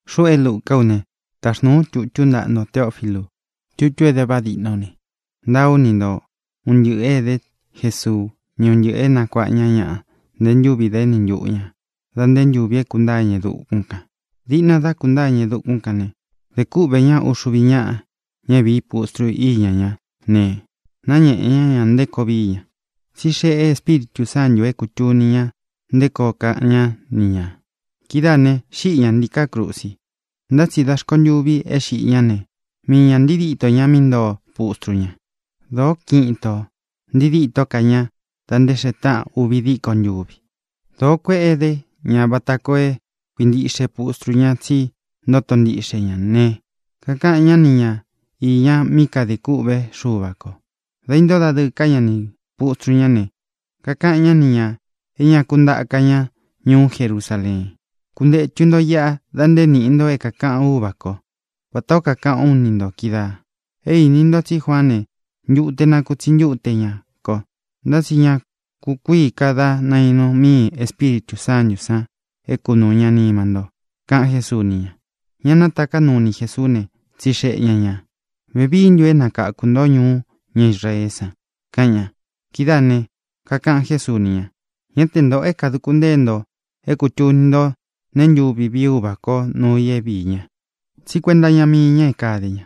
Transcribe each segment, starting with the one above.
Xuꞌú é Lucá u ne, táxnūú u tutú ntaꞌa nto, Teófilu. Tutú é dé vaꞌá diꞌná u ne, ntaa ú ni nto un ntɨꞌɨ̄ é edé Jesuu, ni un ntɨꞌɨ̄ é nakuāꞌa ña ñaꞌa nté ntūvi dá eni ntuꞌu ñā da nté ntūvi é kūntáa ña e dukún kān. Diꞌna dá kūntáa ña e dukún kān né, dē kúꞌvē ñá uxuvi ñáꞌa, ña é vīí pustru íña ña ne, náñēꞌe ñá ña nté koo vií ña. Tsí xeꞌe Espíritū Sántū é kūtuni ña nté koo kaꞌan ñá ni ñā. Kidáā ne, xíꞌi ñā ntiká krusi. Ntá tsi da rkontûvi é xiꞌi ñá ne, mii ñā ntii díto ña mí ntoo pustru ña. Dōó kiꞌin itō ntii díto ká ña da nté xee táꞌan uvi díko ntuvi. Dōó kueꞌe edé ña vata koo é kuīntiꞌxe pustru ña tsí ntoto ntiꞌxe ña ne, kakaꞌan ñá ni ñā iña mí kadē kûꞌvé Xuva kō. Dā intóo dadɨɨ ká ña nī pustru ñá ne, kakaꞌan ñá ni ñā é ña ku ntaka ña ñuú Jerusaleen. —Kuntētu ntó iꞌa da nté niꞌi nto é kākaꞌan Úvā kó, vata ō kaꞌán u ni nto kídaā. É īni nto tsí Juaán ne, ntute nakutsi ntúte ña kō; ntá tsi ña kukuíi ka dá nainu míi Ēspíritū Sántū san é kunūu ñá nima nto —kaꞌan Jésuu ni ña. Ña nátaká nuu ni Jēsuú ne, tsixeꞌe ña ñā: —¿Vevií ntu é nakāku ntó ñuú ña Israeé san? —kaꞌan ña. Kidáā né, kakaꞌan Jésuu ni ña: —Ñá te ntōꞌo é kāduku ntée nto é kūtuni nto nee ntúvi vií Uvā kó nuu i é viī ña. Tsí kuenta iña mii ña é kade ña.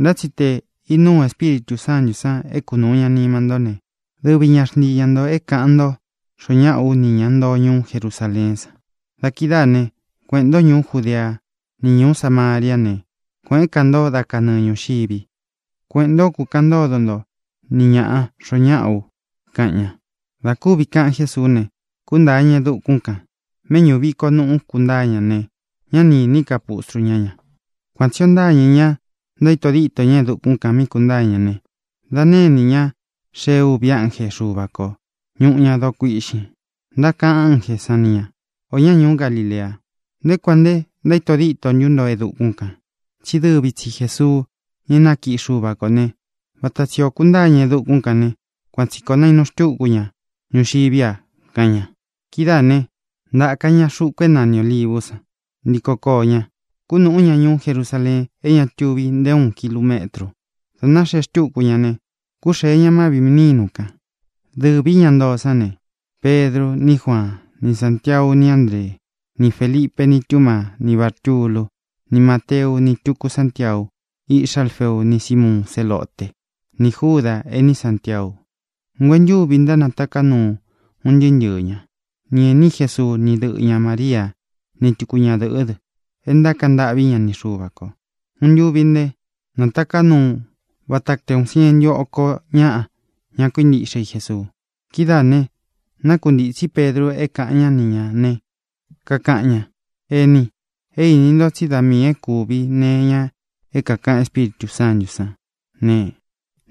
Ntá tsi te īnuu Espíritū Sántū san é kunuu ña nima ntó ne, dɨvi ña xntii ña ntō é kāꞌan ntó xoo ñáꞌa ú ni ña ntoo ñuú Jerusaleén san. Da kidáā né, kueꞌēn ntó ñuú Judea ni ñuú Samaria ne, kuēꞌén ka nto dá kanɨɨ ñūxivi. Kueꞌēn ntó, kukaꞌan ntódo nto ni ñāꞌa xoo ñáꞌa ú —kaꞌan ña. Dā kúvi kaꞌan Jésuú ne, kūntáa ña e dukún kān. Mēꞌñú viko nuꞌu kuntáa ña ne, ñá ni īní ka pustru ñá ña. Kuan tsī o ntáñɨ̄ ña, ntaíto díto ña e dukún kān mí kūntáa ña ne, dā nénī ñá xee uvi ánje Xuva kō, ñuꞌu ña doo kuiꞌxin. Ntákaꞌan ánjē sán ni ñā: —Ō ñá ñuú Galilea, ¿nté kuān nté ntaíto díto ntu nto e dukún kān? Tsí dɨvi tsi Jēsuu, ña é nakiꞌi Xuva kō né, vata tsī ó kūntáa ña e dukún ne, kuan tsī koo nainu xtúku ña ñuxiví a —kaꞌan ña. Kidáā ne, ntáka ña xuku é nani Ōlivú san. Ntíko koō ñá, kunúꞌu ña ñuú Jerusaleen é ña tuvi nté uun kilumetru. Dā náxee xtúku ña ne, kúxee ña má vīꞌi nínu kān. Dɨvī ña ntoo sán ne: Pedru, ní Juaan, ni Sántiau, ni Ándree, ni Félipe, ni Túmaa, ni Bártulu, ni Máteu, ni túku Santiau, iꞌxá Alfeu, ni Símuun Zélote, ni Júda, ení Santiau. Nguentúvi ntánataká nuu un ntɨɨ́ ntɨɨ̄ ñá, ni ēní Jesuu, ni dɨ́ꞌɨ ñā María, ni tuku ñadɨ̄ꞌɨ́ dɨ, é ntákaꞌan ntâꞌví ña ni Xuva kō. Uun ntuvi ne, nátaká nuu vata te uun sientu oko ñaꞌa, ña kuíntiꞌxe i Jesuu. Kidáā ne, nákuntītsí Pedru é kāꞌan ñá ni ñā ne, kakaꞌan ña: —Eni, é īni nto tsí da miī é kuvi nee iña é kākaꞌan Espíritū Sántū sán ne,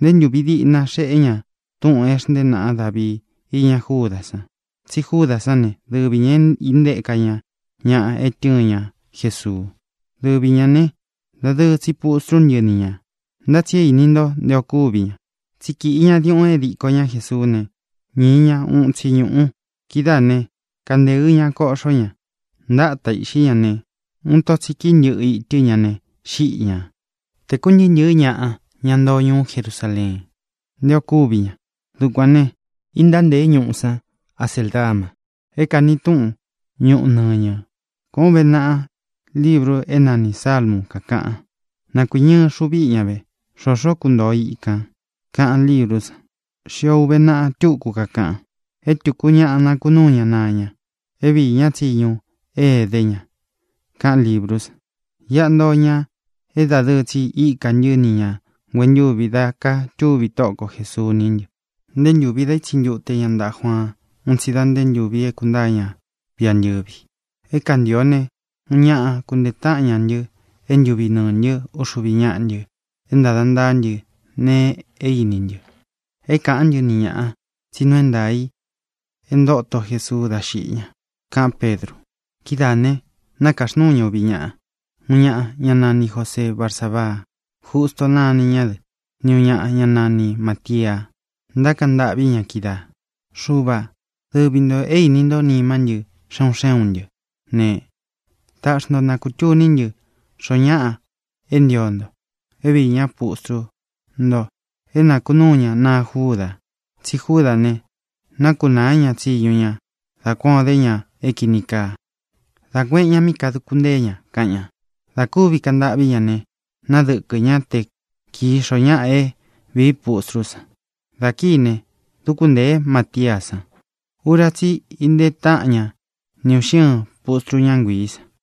nté ntūvi diꞌna xeꞌé ña túꞌūn é xntée naꞌa Davii íña Júdā san. Tsi Júdā sán ne, dɨvi ñā é intéka ña ñaꞌa é tɨ̄ɨn ña Jesuu. Dɨvi ñā ne, dadɨɨ tsi pustru ntɨ́ ni ñā. Ntá tsi é īni ntó nté ō kúvi ña. Tsi kíꞌi ña diuꞌun é diko ña Jēsuú ne, ñīi ñá uun itsi ñūꞌu. Kidáā ne, kanteɨ ña, koꞌxó ña. Ntáta īꞌxí ña ne, uun ito tsi kíi ntɨꞌɨ itɨ́ ña ne, xíꞌi ñā. Tēku ntɨɨ́ ntɨ̄ɨ́ ñaꞌa, ña ntoo ñuú Jerusaleen, nté ō kúvi ña. Dukuān né, īntántēé ñuꞌu san Aceldama, é kāni túꞌun Ñūꞌu Nɨñɨ. Kuān ó uve naꞌa libru é nanī Salmu, kakaꞌan: Na kuīñɨ ixu viꞌi ña ve; xōxó kuntōo ká i ikān, kaꞌan líbrú san. Xío ūve naꞌa túku, kakaꞌan: É tūku ñaꞌa nakunúu ña naa ña, é viī ñá tsiñu é edé ña, kaꞌan líbrú san. ʼIꞌa ntoo ñaꞌa é dadɨɨ tsi íka ntɨ́ ni ñā nguentúvi dá kātúvi Tóꞌo ko Jēsuu ní ntɨ, nté ntūvi dá itsi ntute ña ntaꞌa Juaan un tsi da nté ntūvi é kūntáa ña viꞌi antɨ̄vi. É kāntio ne, uun ñaꞌa kuntee táꞌan ña ntɨ́ é ntuvi nɨɨ̄ ntɨ́ uxuvi ñáꞌa ntɨ é ntāda ntaá ntɨ nee é īni ntɨ́, é kāꞌán ntɨ ni ñaꞌā tsí nuu é ntaā i e ntóto Jesuu dá xiꞌi ña —kaꞌán Pedru. Kidáā ne, nakaxnúu ña úvi ñaꞌa: uun ñaꞌa, ñá nani Jōseé Barsabaa (Justo náni ña dɨ), ni ūun ñaꞌa, ñá nani Mātia. Ntákaꞌan ntâꞌví ña kídaā: —Xuva, dɨvi ntō é īni nto nimá ntɨ xe un xé un ntɨ́ ne, tāꞌxi ntó na kūtuní ntɨ xōo ñáꞌa é ntio nto é viī ñá pustru nto, é nakunúu ña naa Júda. Tsí Júdā ne, nákunāá ña tsiñu ña dá kuan ō dé ña é kīni kaa, dá kuēꞌen ñá mí kadūku ntée ña —kaꞌan ña. Dā kúvi kaꞌan ntâꞌví ña ne, nadɨ́kɨ ñá te kīi xoo ñáꞌa é vīí pustrú san. Dā kíi ne, dúku ntēé Matiá san. Ura tsí i intee táꞌan ña ni ūꞌxi ɨ́ɨn pustru, ñá nguiī san.